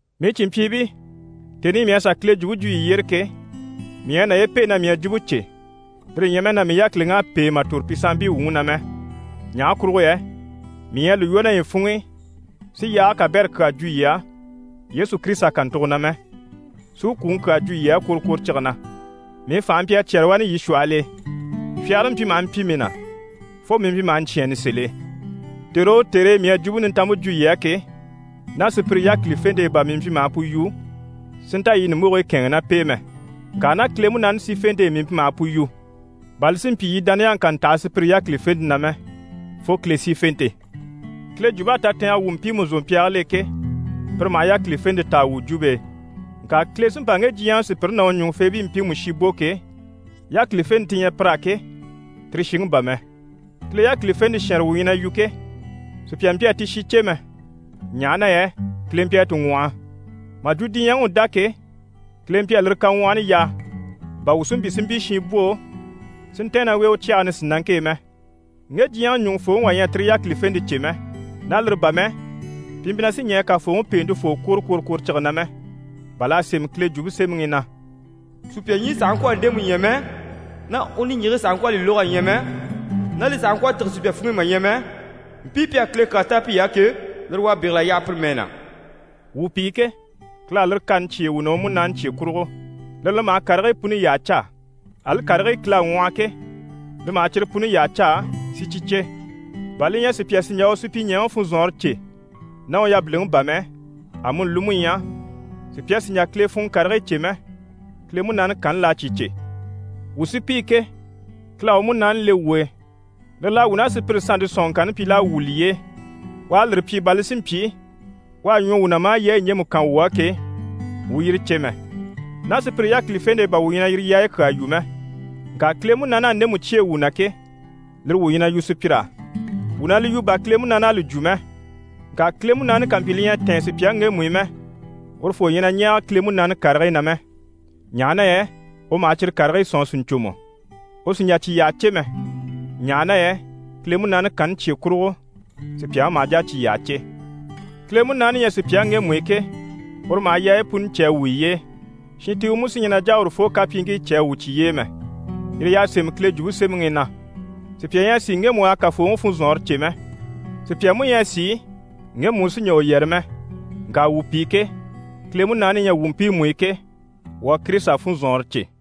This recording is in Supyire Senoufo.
Mii cìnmpyiibii, tèni i mii à sà Kile jwumpe jwo yii yyére ke, mii ɲyɛ a naye pêe na mii à jwumpe cè, lire ɲyɛ mɛ na mii yákiliŋ'à pêe mà tòro pi sanmpii wuŋi na mɛ. Ɲaha kurugo yɛ mii ɲyɛ a li lwɔ́ naye funŋ'i, si yaage kabɛrɛ kyaa jwo yii á, Yesu Kirisita kàntugo na mɛ, si u kwùŋi kyaa jwo yii á kworokworocige na. Mii fànhe mpyi a cyɛ́rɛ wani yii shwɔhɔl'e, fyagare mpyi maha mpyi mii na fo mii mpyi maha ɲcyɛ̂ɛnni sèl'e. Tère o tère e mii à Jwumpe Nintanmpe jwo yii á ke, ná sùpyire yákilifente e bà mii mpyi maha pu yu si nta yii ɲùmbogigii kɛ̂ɛnŋɛ ná p'e mɛ. Ŋka ná Kile Munaani sífente e mii mpyi maha pu yu, bà li si mpyi yii dániyaŋi kà ntaha sùpyire yákilifente na mɛ, fo Kile sífente. Kile jwump'à tatɛɛngɛ wwû mpiimu zòmpyaagil'e ke, pire maha yákilifente taa wuu jwumpe e. Ŋka Kile sí n‑pa ŋge diɲyɛŋi sùpyire ná u ɲùŋufeebii mpiimu shi bò ke, yákilifente ti ɲyɛ pir'á ke, tire shiŋi bà mɛ. Kile yákilifente shɛnrɛ wuu ɲyɛ na yu ke, sùpya mpyi a ti shi cè mɛ, ɲaha na yɛ Kile mpyi a ti ŋwɔhɔ. Mà jwo diɲyɛŋi u dá ke, Kile mpyi a lire kaŋwɔhɔni yaa, bà wuu si mpyi si mpyi shinbwoo si ntɛ̀ɛn ná u e u cyage nisinaŋke e mɛ. Ŋge diɲyɛŋi ɲùŋufooŋi wà ɲyɛ a tire yákilifente cè mɛ. Ná lire bà mɛ, pi mpyi na sì ɲɛɛ Kafooŋi Peentefoo kwòro kworokworocige na mɛ. Bà l'à sémɛ Kile Jwumpe Semɛŋi i na: «Sùpya ɲyii sàha ŋkwɔ̀ a ndemu ɲya mɛ, ná niŋgyii sàha ŋkwɔ̀ a li lóg'a ɲya mɛ, ná li sàha ŋkwɔ̀ a tîge sùpya funŋ'i mà ɲya mɛ, mpii pi à Kile kyaa táan piy'á ke, lire u à bégel'a yaha pire mɛɛ na.» Wuu pi ke, Kile à lire kani cyêe wuu na, u Munaani cye kurugo. Lire li maha karigii puni yyaha caa, ali karigii Kile à ŋwɔhɔ ke, li maha cyire puni yyaha caa, si cyi cè, bà li ɲyɛ sùpya sì n‑jà u supyiɲɛɛŋi funzɔnŋɔre cè ná u yabiliŋi bà mɛ, amuni li mú ɲyɛ sùpya sì n‑jà Kile funŋɔ karigii cè mɛ, Kile Munaani kanni l'à cyi cè. Wuu sí pi ke, Kile à u Munaani le wuu e, lire l'à wuu ná sùpyire sannte sɔ̀nŋɔŋkanni pyi l'à wwû liye e. U à lire pyi bà li si mpyi, u à ɲwɔ wuu na maa yaayi ɲjemu kan wuu á ke, wuu u yire cè mɛ. Ná sùpyire yákilifente e bà wuu ɲyɛ na yire yaayi kyaa yu mɛ. Ŋka Kile Munaani à ndemu cyêe wuu na ke, lire wuu ɲyɛ na yu sùpyir'á, wuu na li yu bà Kile Munaani à li jwo mɛ. Ŋka Kile Munaani ká mpyi li ɲyɛ a tɛ̀ɛn sùpyaŋi ŋgemu i mɛ, urufoo ɲyɛ na ɲɛɛge Kile Munaani karigii na mɛ, ɲaha na yɛ u maha cyire karigii sɔ̂nŋi sìɲcomɔ. U sì n‑jà cyi yyaha cè mɛ, ɲaha na yɛ Kile Munaani kanni cye kurugo sùpyaŋi maha jà a cyi yyaha cè. Kile Munaani ɲyɛ sùpyaŋi ŋgemu i ke, uru u maha yaayi puni cè a wwû yiye e. Shintiiwe mú sí ɲyɛ na n‑jà a urufoo kapyiiŋkii cè a wwû cyiye e mɛ. Yire y'à sémɛ Kile Jwumpe Semɛŋi i na: «Sùpya ɲyɛ a sìi ŋgemu u à Kafooŋi funzɔnŋɔre cè mɛ? Sùpya mú ɲyɛ a sìi ŋgemu u sí n‑jà u yɛrɛ mɛ.» Ŋka wuu pi ke, Kile Munaani ɲyɛ wuu mpiimu i ke, wuu à Kirisita funzɔnŋɔre cè.